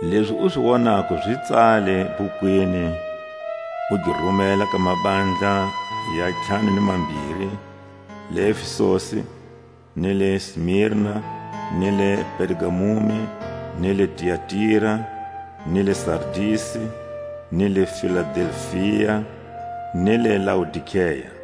Lezi u zi wonako zi tsale bhukwini, u gi rumela ka mabandla ya ntlhanu ni mambiri: le Efesusi; ni le Sinima, ni le Pergamumi, ni le Tiatira, ni le Sardisi, ni le Filadelfia, ni le Loadikea.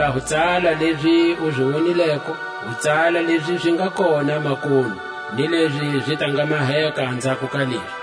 Hikwalaho tsala lezi u zi wonileko, u tsala lezi zi nga kona makunu, ni lezi zi ta nga maheka anzhako ka lezi.